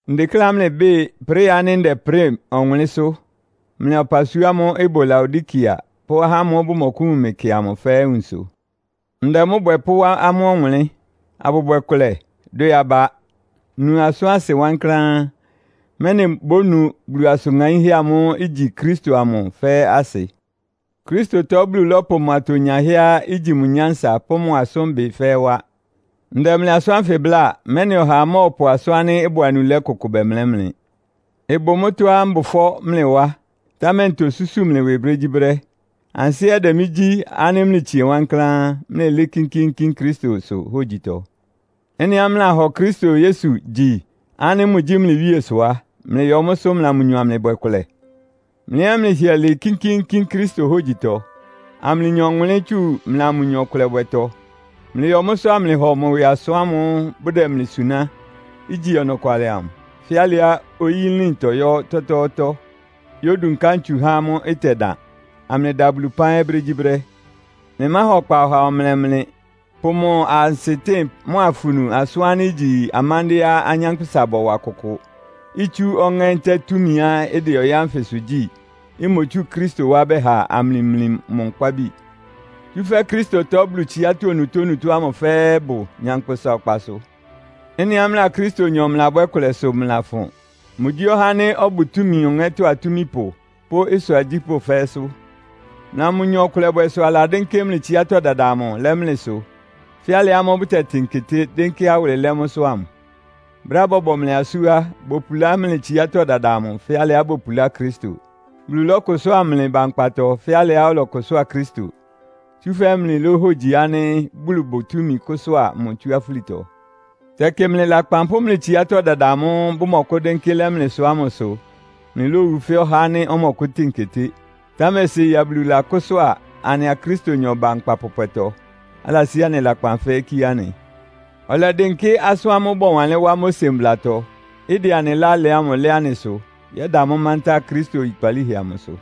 Ndekléá mlɩbɩ́ɩ ɩprɩ́ɩ ánɩ́ ndɛprɩ́ɩ ɔwʋnlɩ́nsʋ́, mlɩa ɔpasua ámʋ́ʋ́ ɩbʋ Laodikea pʋ́ ahá ámʋ́ʋ́ bʋmɔkʋ́wun mɩ kɩ amʋ fɛ́ɛ́ nwunsʋ. Ndɛ mʋ́ bwɛ pʋ́wá amʋ́ ɔwʋnlɩ́n, abʋbwɛ kʋlɛ, dwɛ aba, nu asʋ́n asɩ wankláán, mɛ́nɩ bónu Bulu asʋ́n ŋaínhɛ́ amʋ́ʋ́ igyi Kristo amʋ fɛ́ɛ́ asɩ. Kristotɔ Bulu lɔ́pʋ mʋ atonyahɛ́á igyi mʋ nyánsa pʋ́ mʋ asʋ́nbɩ fɛ́ɛ́ wá. Ndɛ mlɩ asʋ́n ánfɩ bláa, mɛ́nɩ ɔhaa mɔ́ɔpʋ asʋ́n ánɩ́ ɩbʋ anulɛ́ kʋkʋ bɛmlɛ́ mlɩ. Ɩbʋ mʋ́tɔ́á mbʋ ɩfɔ́ mlɩ wá, támɛ ntosúsu mlɩ ɩwɩ brégyíbrɛ́. Ansɩ́ ɛ́ ɩdɛ mɩ́ gyí ánɩ́ mlɩtsie wankláán, mlɩlɩ́ɩ́ kínkíínkín Kristosʋ hógyitɔ. Ɩ́nɩá mlɩlahɔ Kristo Yesu gyi ánɩ́ mʋgyí mlɩ Wíe sʋ á, mlɩyɔ mʋ́sʋ́ mlɩa mʋnyɔ amlɩbwɛ kʋlɛ. Mlɩ ɛ́ mlɩhɩɛ lɩɩ kínkíínkín Kristo hógyitɔ, amlɩnya ɔwʋnlɩ́n tsu mlɩa mʋnyɔ ɩkʋlɛbwɛtɔ. Mlɩyɔ mʋ́sʋ́ amlɩhɔ mʋ ɩwɩ asʋ́n ámʋ́ʋ́ bʋdɛ mlɩ suná, igyi ɔnɔkwalɩ amʋ, fɛ́ alɩá oyí nlín tɔyɔ́ ɔtɔ́tɔ́ɔ́tɔ́, yódúnká ntsu há mʋ́ ɩtɛdan, amlɩda Bulu ɩpán ɛ́ brégyíbrɛ́. Mlɩmáha ɔkpa ɔhaa ɔmlɛ mlɩ, pʋ mʋ ansɩtɩ́ɩn mʋ́a afunu asʋ́n ánɩ́ igyi amándɩ́ɛ́á anyánkpʋ́sa bɔwa kʋkʋ, itsú ɔŋɛ́ ntɛ́ɛ túmiá ɩdɛ ɔyɩ́ ánfɩsʋ gyí, imotsú Kristo wá bɛha amlɩmli mʋ nkpábi. Tsúfɛ́ Kristotɔ Bulu tsiátɔ́ onutónutó ámʋ fɛ́ɛ́ ɩbʋ nyankpʋsa ɔkpasʋ. Ɩ́nɩá mlɩa Kristonyɔ mlɩlabwɛ́ kʋlɛ sʋ mlɩlafʋn. Mʋgyí ɔhá ánɩ́ ɔbʋ túmi ɔŋɛ́tɔ́ atúmipʋ pʋ́ ɩsʋ agyípʋ́ fɛ́ɛ́sʋ́. Mlɩa mʋnyɔ ɩkʋlɛbwɛ sʋ aladɩ́nkɩ́ mlɩ tsiátɔ́ dada amʋ lɛ́ mlɩsʋ fɛ́ alɩ ámʋ́ʋ́ bʋtɛtɩn keté, dɩ́nkɩ́ awʋlɩ lɛ́ mʋ́sʋ́ ámʋ. Brɛ́á bɔbɔ mlɩ asú á, bopulá mlɩ tsiátɔ́ dada amʋ fɛ́ alɩá bopulá Kristo; Bulu lɔ́kʋsʋ́a mlɩ ba nkpatɔ fɛ́ alɩá ɔlɔkʋsʋ́a Kristo, tsúfɛ́ mlɩlóhogyi ánɩ́ Bulu bʋ túmi kʋ́sʋ́a mʋ tsú afúlitɔ. Tɛkɩ mlɩ lakpan pʋ́ mlɩ tsiátɔ́ dada amʋ́ʋ́ bʋmɔkʋ́dɩ́nkɩ́ lɛ́ mlɩsʋ ámʋ sʋ mlɩlówu fɛ́ ɔhá ánɩ́ ɔmɔkʋ́tɩn keté. Támɛ séi á, Bulu lakʋ́sʋ́a anɩa Kristonyɔ ba nkpa pɔpwɛtɔ, alasí anɩ lakpan fɛ́ɛ́ kíé anɩ. Ɔlɛdɩnkɩ́ asʋ́n ámʋ́ʋ́ bɔwanlɩ́n wá Mose mblatɔ, ɩdɛ anɩ ɩlá lɛ ámʋ lɛ́ anɩsʋ, yɛ́da mʋ́ mántá Kristo oyikpalíhɛ amʋsʋ.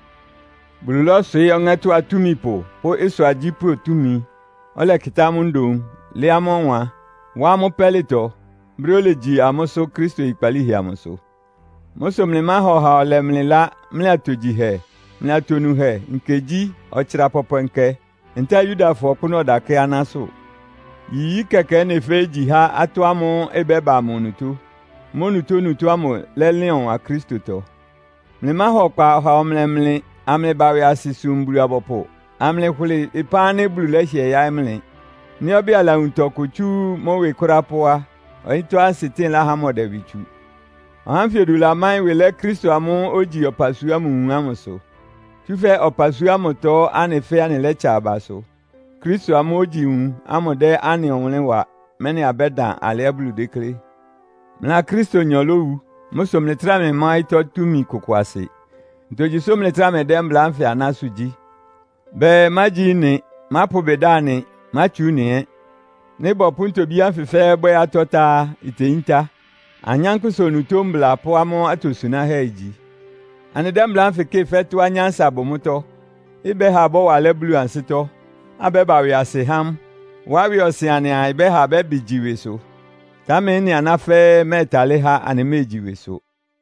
Bulu lɔ́swɩɩ́ ɔŋɛ́tɔ́ atúmipʋ pʋ́ ɩsʋ agyípʋ́ túmi, ɔlɛkɩtá amʋ́ ndoun, lɛ́ amʋ́ ɔwan, wá amʋ́ pɛ́lɩtɔ, brɛ́ olegyi amʋ́sʋ́ Kristo oyikpalíhɛ amʋsʋ. Mʋ́ sʋ mlɩmáha ɔhaa ɔlɛ mlɩ ɩlá mlɩ atogyihɛ, mlɩ atonuhɛ, nkegyí, ɔtsra pɔpwɛ nkɛ, ntɛ́ɛ Yudafɔ ɔkpʋ́nʋ́ ɔdakɛ́ aná sʋ. Yiyí kɛkɛ ɩ́nɩ fɛ́ɛ́ igyi há atɔ́ ámʋ́ʋ́ ɩbɛ́ba amʋ onutó. Mʋ́ onutónutó ámʋ lɛ́lɩn ɔwan Kristotɔ. Mlɩmáha ɔkpa ɔhaa ɔmlɛ mlɩ amlɩba ɩwɩasɩ sum Bulu-abɔpʋ, amlɩhʋlɩ ɩpán ánɩ́ Bulu lɛ́hɩɛ yáɩ́ mlɩ. Nɩ́ ɔbɛ́ɛ alawun tɔkʋ tsú mʋ́ ɩwɩ kʋ́ráá pó á, ɔyɩ́tɔ́ ansɩtɩ́ɩn láhá mʋ ɔdɛ ɩwɩ tsu. Ɔhá ánfɩ odu lamáɩ́n ɩwɩ lɛ́ Kristo amʋ́ʋ́ ógyi ɔpasua ámʋ nwun ámʋsʋ. Tsúfɛ́ ɔpasua ámʋtɔ anɩ fɛ́ɛ́ anɩlɛ́tsa abasʋ, Kristo amʋ́ʋ́ ogyi nwun ámʋ dɛ́ anɩ ɔwʋnlɩ́n wa, mɛ́nɩ abɛ́dan alɩá Bulu déklé. Mlɩa Kristonyɔ lówu. Mʋ́ sʋ mlɩtráa mlɩmá ɔyɩ́tɔ́ túmi kʋkʋ asɩ. Ntogyi sʋ́ mlɩtráa mlɩdɛ́ mbla ánfɩ anásʋ́ gyí? Bɛɛ, “Mágyi ɩ́nɩ. Mápʋ ɩbɩ da ɩ́nɩ, mátsu ɩ́nɩ ɛ́!” Nɩ́ bɔpʋ́ ntobí ánfɩ fɛ́ɛ́ bwɛ́ atɔ́ tá á, iteyíntá. Anyánkpʋ́sa onutó mbla pʋ́ amʋ́ atosunáhɛ́ igyi. Anɩdɛ́ mbla ánfɩ kɩ́ɩ fɛ́ tɔ́á nyánsa bʋ mʋ́tɔ́, ɩbɛ́ha abɔ́wa alɛ́ Bulu ansɩ́tɔ́, abɛ́ba ɩwɩasɩ há mʋ, wá ɩwɩ ɔsɩn anɩaa ɩbɛ́ha abɛ́bɩ gyi ɩwɩsʋ. Támɛ ɩ́nɩ aná fɛ́ɛ́ ɩmɛ́ɛtalɩ́ há anɩméegyi ɩwɩsʋ.